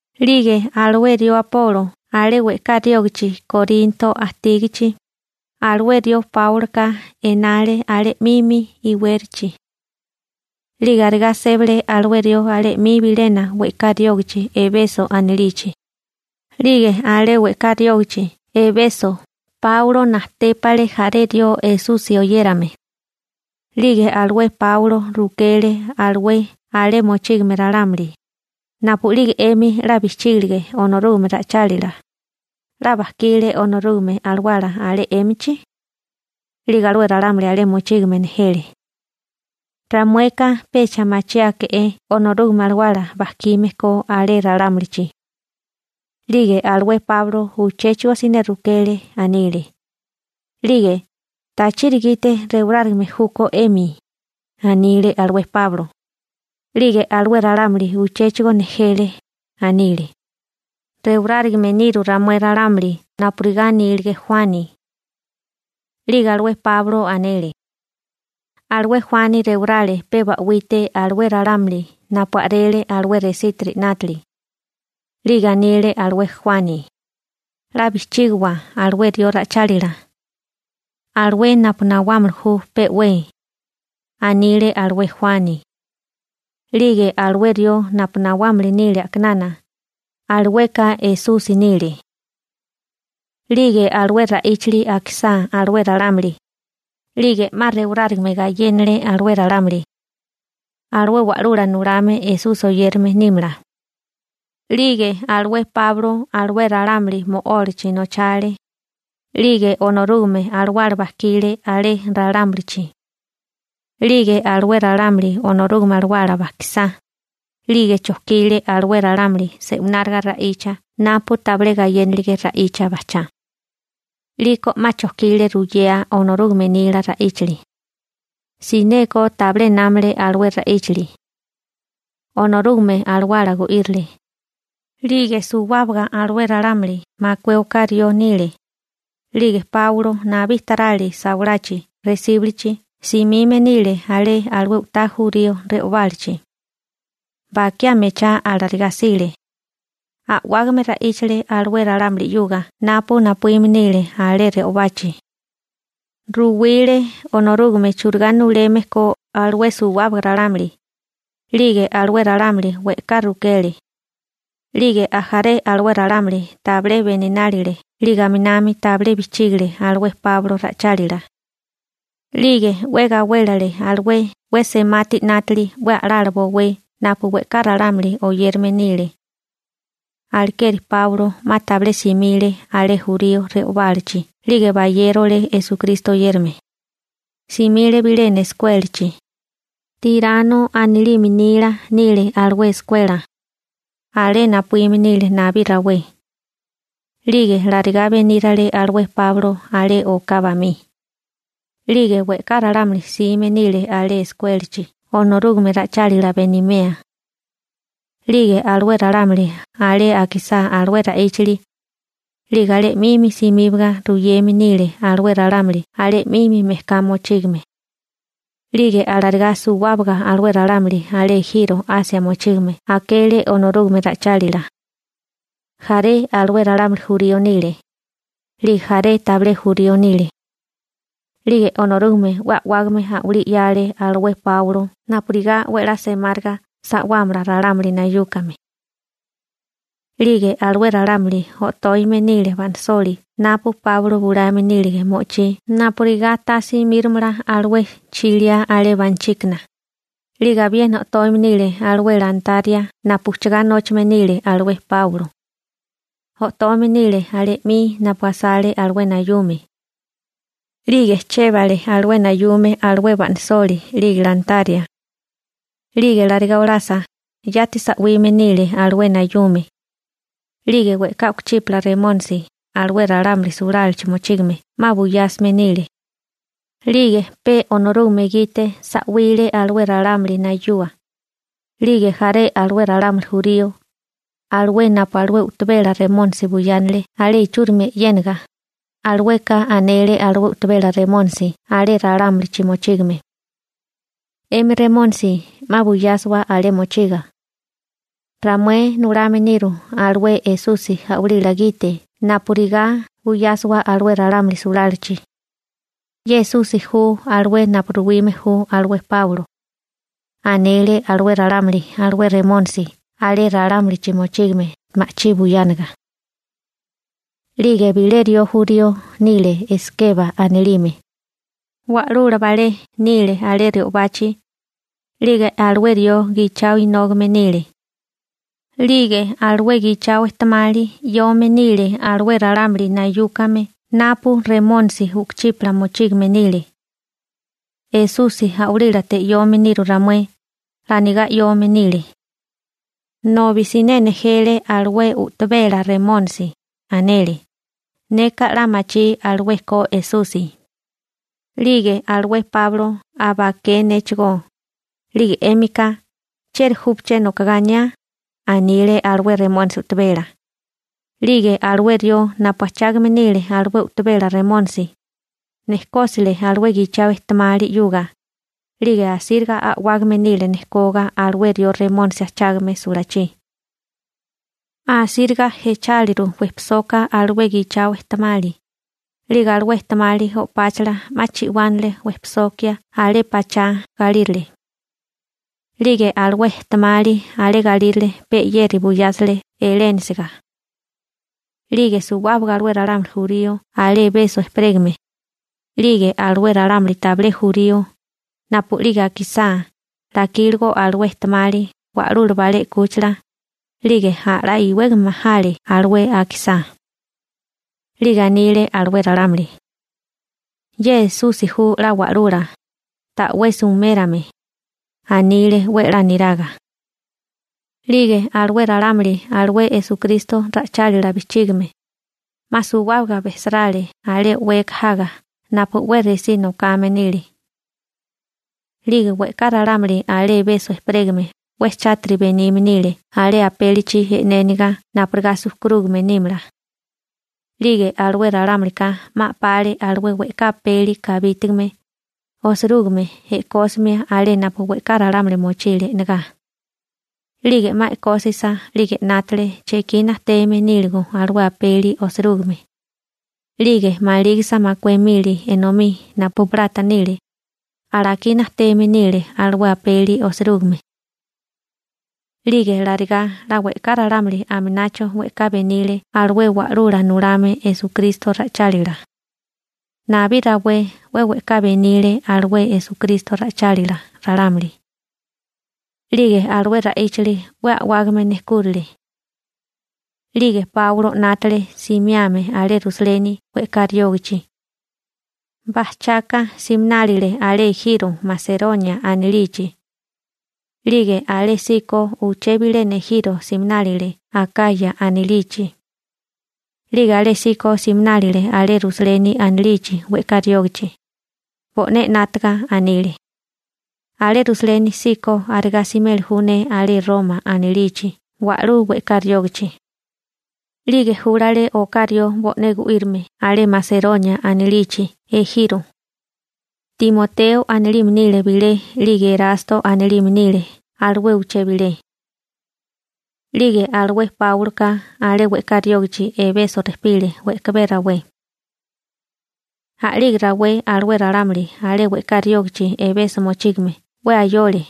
'Lige alué rió Apolo alé we'ká riógichi Korinto ajtígichi, alué rió Páuloka enale alé 'mimi iwérachi. 'Lige arigá sébale alué rió alé 'mi bilena we'ká riógichi Ebeso anilichi. 'Lige alé we'ká riógichi Ebeso Páulo najtépale jaré rió Esusi oyérame. 'Lige alué Páulo rukele alué alé mochígame ralámuli: ―Napu'lige 'emi 'la bijchígilige Onorúgame ra'ichálila, ¿'la bajkile Onorúgame Alawala alé 'émichi? 'Lige alué ralámuli alé mochígame nejele: ―Ramueka tabilé machiáke'é Onorúgame Alawala bajkime ko alé ralámulichi. 'Lige alué Páulo uchéchigo siné rukele, anile: ―'Lige ¿tachiri gite rewarárigame júkó 'emi? ―anile alué Páulo. 'Lige alué ralámuli uchéchigo nejele, anile: ―Rewarárigame niru ramué ralámuli napurigá anílige Juani. 'Lige alué Páulo anele: ―Alué Juani rewarale pe ba'wite alué ralámuli napu a'rele alué resítiri 'nátili. 'Lige anile alué Juani: «'La bijchígiwa alué rió ra'ichálila, alué napu nawámili ju pe'wé», anile alué Juani. 'Lige alué rió napu nawámili nile a'kinana, alueka Esusi nile. 'Lige alué ra'íchili akisá alué ralámuli, 'lige 'ma rewarárigame gayénale alué ralámuli, alué Wa'lula Nulame Esusi oyérame nímala. 'Lige alué Páulo alué ralámuli mo'ólachi nochale. 'Lige Onorúgame Alawala bajkile alé ralámulichi. 'Lige alué ralámuli Onorúgame Alawala bajkisá, 'lige chojkile alué ralámuli se'wináriga ra'icha napu tabilé gayénalige ra'icha bajchá. 'Liko 'ma chojkile ruyea Onorúgame nila ra'íchali. Sineko tabilé námale alué ra'íchali. Onorúgame Alawala gu'írile. 'Lige suwábaga alué ralámuli makué oká rió nile. 'Lige Páulo nabí tarali sawalachi resíbulichi simime nile alé alué u'tá jurío re'obálachi. Bakiá mechá alarigá 'sile. A'wágame ra'íchale alué ralámuli 'yuga napu napuíme nile alé re'obachi. Ruwile Onorúgame churigá nuleme ko alué suwábaga ralámuli. 'Lige alué ralámuli we'ká rukele. 'Lige ajaré alué ralámuli tabilé beninálile 'lige aminami tabilé bijchígile alué Páulo ra'ichálila. 'Lige 'we gawélele alué 'we semati 'nátili 'we a'lala bowé napu we'ká ralámuli oyérame nile. Alekeri Páulo 'ma tabilé simile alé jurío re'obálachi 'lige bayérole Esukristo oyérame. Simile bilena eskuélachi, Tirano anilime nila nile alué eskuela. Alé napuíme nile nabí rawé. 'Lige larigá benírale alué Páulo alé oká bamí, 'lige we'ká ralámuli jsime nile alé eskuélachi Onorúgame ra'ichálila benimea. 'Lige alué ralámuli alé akisá alué ra'íchili, 'lige alé 'mimi simíbaga ruyeme nile alué ralámuli alé 'mimi mejká mochígame. 'Lige alarigá suwábaga alué ralámuli alé ejiro Asia mochígame akele Onorúgame ra'ichálila. Jaré alué ralámuli jurío nile, 'lige jaré tabilé jurío nile. 'Lige Onorúgame 'we a'wágame a'walí 'yale alué Páulo napurigá 'we 'la semáriga sa'wámala ralámuli nayúkame. 'Lige alué ralámuli o'tóime nile ba'nasoli napu Páulo bulame nílige mo'ochí napurigá ta simíromala alué chiliá alé buichíkana. 'Lige abiena o'toime nile alué lantaria napu ujchugá nóchame nile alué Páulo. O'toime nile alé 'mi napu asale alué nayume, 'lige chébale alué nayume alué ba'nisoli 'lige lantaria. 'Lige alarigá olasa, yati sa'wime nile alué nayume. 'Lige we'ká u'kuchípala remónisi alé ralámuli sulálachi mochígame 'ma buyásime nile. 'Lige pe Onorúgame gite sa'wile alué ralámuli nayua. 'Lige jaré alué ralámuli jurío, alué napu alué u'tabela remónisi buyánele alé ichúrimi e'yénaga, alueka anele alué u'tabela remónisi alé ralámulichi mochígame: ―'Emi remónisi 'ma buyásiwa alé mochiga. Ramué nulame niru alué Esusi a'walila gite napurigá buyásiwa alué ralámuli sulálachi. Ye Esusi ju alué napu ruwime ju alué Páulo ―anele alué ralámuli alué remónisi alé ralámulichi mochígame ma'chí buyániga. 'Lige bilé rió jurío nile Eskeba anilime, wa'lula balé nile alé re'obachi. 'Lige alué rió gichao inógame nile. 'Lige alué gichao ejtemali 'yome nile alué ralámuli nayúkame napu remónisi u'kuchípala mochígame nile. «Esusi a'walílate 'yome niru ramué», 'la anigá 'yome nile. Nobi siné nejele alué u'tabela remónisi, anele: ―Neka 'la machí alué ko Esusi, 'lige alué Páulo aba aké néchigó. 'Lige 'émika, ¿chieri júpaché nokagá aniá? ―anile alué remónisi u'tabela. 'Lige alué rió napu ajchágame nile alué u'tabela remónisi, nejkósile alué gichao ejtemali 'yuga. 'Lige asíriga a'wágame nile nejkoga alué rió remónisi ajchágame sulachí. Asíriga jecháliru wejpisoka alué gichao ejtemali. 'Lige alué ejtemali o'páchala 'ma chi'wánale wejpisokia alé pachá galírale. 'Lige alué ejtemali alé galírale pe 'yeri buyásile elénasiga. 'Lige suwábaga alué ralámuli jurío alé Ebeso ejperégame, 'lige alué ralámuli tabilé jurío, napu'lige akisá 'la ikíligo alué ejtemali wa'lula balé 'kúchila, 'lige a'lá iwégame majale alué akisá. 'Lige anile alué ralámuli: ―Ye Esusi ju 'la Wa'lula, ta'wesi umérame ―anile 'we 'la niraga. 'Lige alué ralámuli alué Esukristo ra'ichálila bijchígime, 'ma suwábaga bejsarale alé o'weka jaga napu 'we resí nokame nile. 'Lige we'ká ralámuli alé Ebeso ejperégame 'we chátiri benime nile alé apélichi e'néniga napurigá sujkurúgame nímala. 'Lige alué ralámulika 'ma a'pale alué we'ká apeli kabítigame osirúgime e'kósimia alé napu we'ká ralámuli mochile e'negá. 'Lige 'ma e'kósisa 'lige 'nátale chekí najteme níligo alué apeli osirúgime. 'Lige malígisa makué mili enomí napu plata nile, alakí najteme nile alué apeli osirúgime. 'Lige larigá 'la we'ká ralámuli aminacho we'ká benile alué Wa'lula Nulame Esukristo ra'ichálila. Nabí rawé 'we we'ká benile alué Esukristo ra'ichálila ralámuli. 'Lige alué ra'íchili 'we a'wágame nejkúrale. 'Lige Páulo 'nátale simiame alé Rusaleni we'ká riógachi. Bajchaka siminálile alé ejiro Maseronia anilichi. 'Lige alésíko uché bilena ejiro siminálile Akaya anilichi. 'Lige alésíko siminálile alé Rusaleni anilichi we'ká riógichi. Bo'né 'nátaga anile: ―Alé Rusaleni síkó arigá simeli ju ne alé Roma anilichi wa'lú we'ká riógichi. 'Lige júlale oká rió bo'né gu'írame alé Maseronia anilichi ejiro. Timoteo anilime nile bilé 'lige Erasto anilime nile alué uché bilé. 'Lige alué Páuloka alé we'ká riógichi Ebeso rejpile we'kabé rawé. A'lige rawé alué ralámuli alé we'ká riógichi Ebeso mochígame 'we ayole,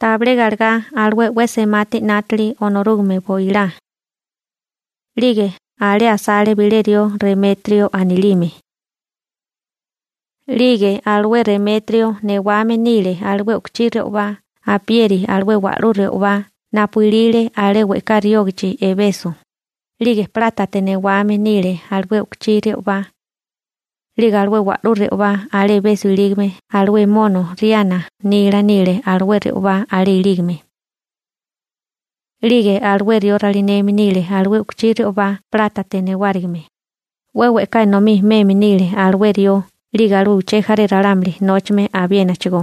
tabilé galegá alué 'we semati 'nátili Onorúgame boilá. 'Lige alé asale bilé rió Remetrio anilime. 'Lige alué Remetrio newame nile alué u'kuchí re'obá apieri alué wa'lú re'obá napu ilile alé we'ká riógichi Ebeso, 'lige plátate newame nile alué u'kuchí re'obá. 'Lige alué wa'lú re'obá alé Ebeso ilígame alué mono Riana (Artemisa) nila nile alué re'obá alé ilígame. 'Lige alué rió ralineme nile alué u'kuchí re'obá plátate newárigime, 'we we'ká enomí meme nile alué rió 'lige alué uché jaré ralámuli nóchame abiénachigó.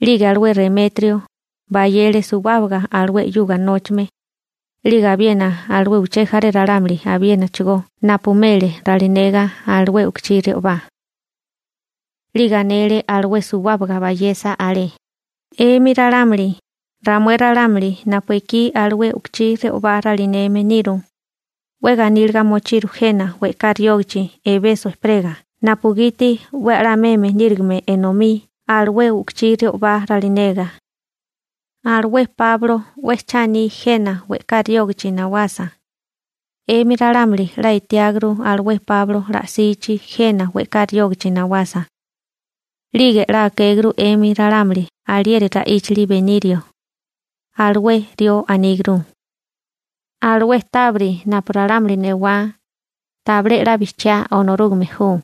'Lige alué Remetrio, bayele suwábaga alué 'yuga nóchame, 'lige abiena alué uché jaré ralámuli abiénachigo napu mele ralinega alué u'kuchí re'obá. 'Lige anele alué suwábaga bayesa alé: ―'Emi ralámuli, ramué ralámuli napu ekí alué u'kuchí re'obá ralineme niru, 'we ganíliga mochiru jena we'ká riógichi Ebeso ejperega napugiti 'we a'lá meme nírigime enomí alué u'kuchí re'obá ralinega. Alué Páulo 'we cha aní jena we'ká riógichi nawasa. 'Emi ralámuli 'la etiáguru alué Páulo la'sichi jena we'ká riógichi nawasa. 'Lige 'la akéguru 'emi ralámuli alieri ra'íchili benirio. Alué rió aníguru: «Alué tábiri napu ralámuli newá, tabilé 'la bijchiá Onorúgame ju.»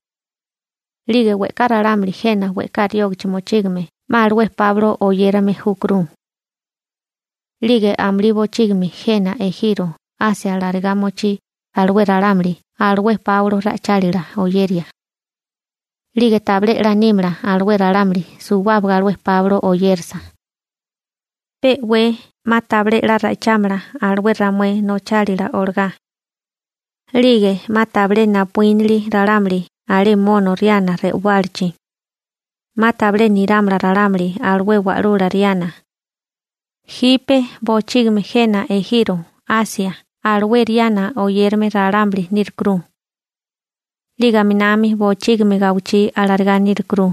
'Lige we'ká ralámuli jena we'ká riógichi mochígame 'ma alué Páulo oyérame júkuru. 'Lige amulí bochígimi jena ejiro Asia larigá mochí alué ralámuli alué Páulo ra'ichálila oyeria. 'Lige tabilé 'la nímala alué ralámuli suwábaga alué Páulo oyérasa. Pe'wé 'ma tabilé 'la ra'ichámala alué ramué nochálila olagá. 'Lige 'ma tabilé napuínili ralámuli alé mono Riana re'obálachi. 'Ma tabilé nirámala ralámuli alué wa'lula Riana. Jipe bochígimi jena ejiro Asia alué Riana oyérame ralámuli nírukuru. 'Lige aminami bochígimi gawichí alarigá nírukuru.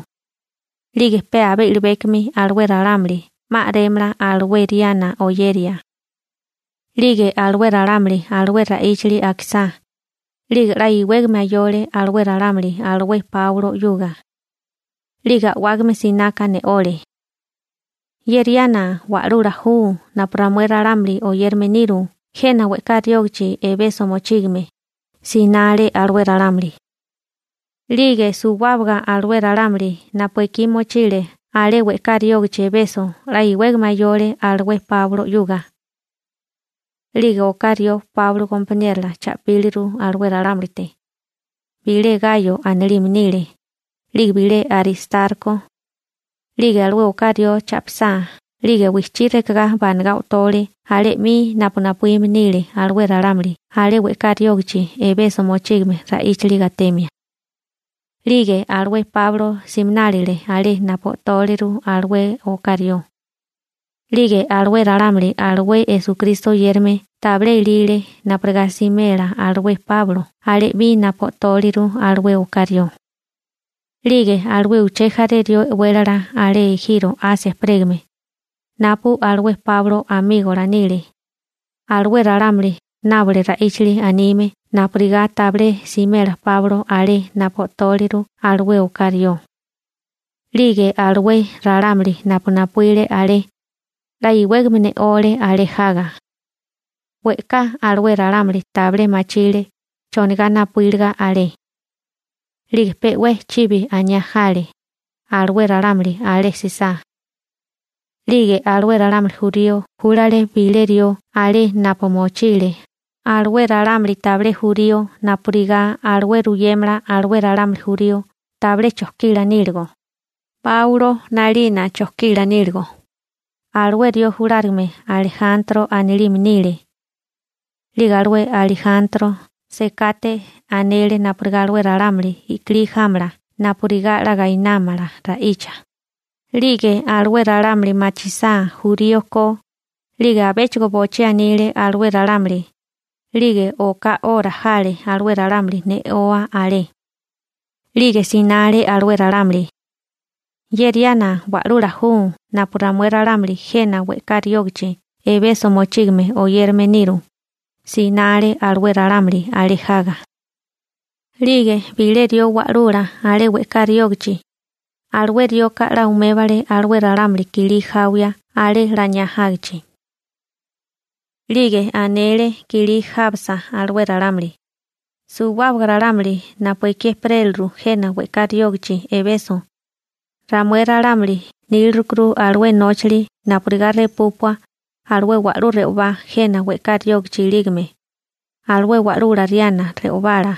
'Lige pe abé i'libékomi alué ralámuli 'ma a'rémala alué Riana oyeria. 'Lige alué ralámuli alué ra'íchili akisá, 'lige 'la iwégame ayole alué ralámuli alué Páulo 'yuga. 'Lige a'wágame sináká ne'ole: ―¡Ye Riana wa'lula ju napu ramué ralámuli oyérame niru jena we'ká riógichi Ebeso mochígame! ―sinale alué ralámuli. 'Lige suwábaga alué ralámuli napu ekí mochile alé we'ká riógichi Ebeso 'la iwégame ayole alué Páulo 'yuga. 'Lige oká rió Páulo gompaniérola cha'píliru alué ralámulite. Bilé Gayo anilime nile, 'lige bilé Aristarko. 'Lige alué oká rió cha'pisá, 'lige wijchí rekegá banagá o'tole alé 'mi napu napuíme nile alué ralámuli alé we'ká riógichi Ebeso mochígame ra'íchili gatemia. 'Lige alué Páulo siminálile alé napu o'tóleru alué oká rió. 'Lige alué ralámuli alué Esukristo oyérame tabilé elile napurigá simela alué Páulo alé 'mi napu o'tóleru alué oká rió. 'Lige alué uché jaré rió e'wélala alé ejiro Asia ejperégame, napu alué Páulo amígola nile, alué ralámuli nábole ra'íchali anime napurigá tabilé simela Páulo alé napu o'tóliru alué oká rió. 'Lige alué ralámuli napu napuíle alé, 'la iwégame ne'ole alé jaga. We'ká alué ralámuli tabilé machile chonigá napuíliga alé. 'Lige pe'wé chibi aniá jale alué ralámuli alé jsisá. 'Lige alué ralámuli jurío júlale bilé rió alé napu mochile alué ralámuli tabilé jurío napurigá alué ruyémala alué ralámuli jurío tabilé chojkila níligo, Páulo 'nalina chojkila níligo. Alué rió julárigame Alejantro anilime nile. 'Lige alué Alijantro sekate anele napurigá alué ralámuli i'kilí jámala napurigá 'la gainámala ra'icha. 'Lige alué ralámuli machisá jurío ko, 'lige abéchigo bochí anile alué ralámuli. 'Lige oká 'ora jale alué ralámuli ne'oa alé. 'Lige sinale alué ralámuli: ―¡Ye Riana wa'lula ju napu ramué ralámuli jena we'ká riógichi Ebeso mochígame oyérame niru! ―sinale alué ralámuli alé jaga. 'Lige bilé rió wa'lula alé we'ká riógichi, alué rioka 'la umébale alué ralámuli kilí jawia alé laniá jágichi. 'Lige anele kilí jábasa alué ralámuli: ―Suwábaga ralámuli napu ekí ejperéliru jena we'ká riógichi Ebeso, ramué ralámuli nílirukuru alué nóchili napurigá repúpua alué wa'lú re'obá jena we'ká riógichi ilígame, alué wa'lula Riana re'obala.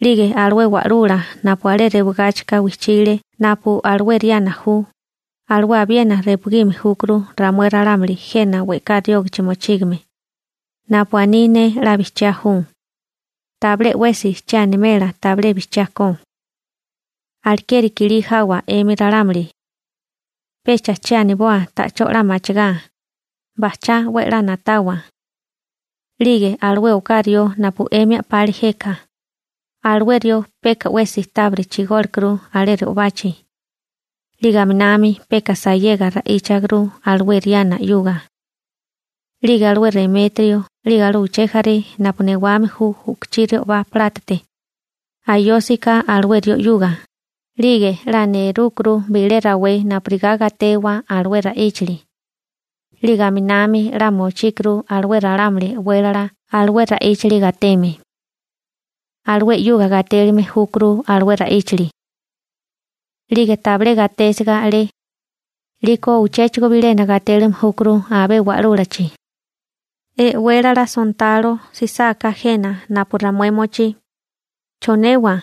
'Lige alué wa'lula napu alé rewagáchika wijchile napu alué Riana ju, alué abiena repugime júkuru ramué ralámuli jena we'ká riógichi mochígame. Napu aní ne 'la bijchiá ju. Tabilé 'wesi che animela tabilé bijchiá ko. Alekeri kilí jawa 'emi ralámuli, pecha che aniboa ta'chó 'la machigá. Bajchá 'we a'lá na'tawa. 'Lige alué oká rió napu 'emi a'pale jeka, alué rió peka 'wesi tábiri chigólekuru alé re'obachi. 'Lige aminami peka sayega ra'íchaguru alué Riana 'yuga. 'Lige alué Remetrio, 'lige alué uché jaré napu newame ju u'kuchí re'obá plátate, ayósika alué rió 'yuga, 'lige 'la nerúkurú bilé rawé napurigá gatewa alué ra'íchili. 'Lige aminami 'la mochíkurú alué ralámuli e'wélala alué ra'íchili gateme. Alué 'yuga gatélime júkuru alué ra'íchili. 'Lige tabilé gatésiga alé, 'liko uchéchigo bilena gatélime júkuru abé wa'lúlachi. E'wélala sontalo jsisáká jena napu ramué mochí, ¿chonewa?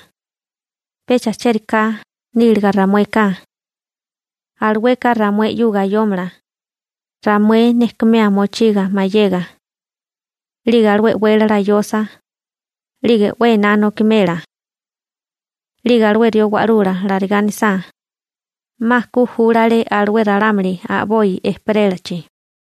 Pecha chériká níliga ramueka. Alueka ramué 'yuga ayómala, ramué nejkumea mochiga mayega. 'Lige alué e'wélala ayosa, 'lige 'we ená nokimela. 'Lige alué rió wa'lula larigá anisá, 'ma ku júlale alué ralámuli a'boi ejperélachi.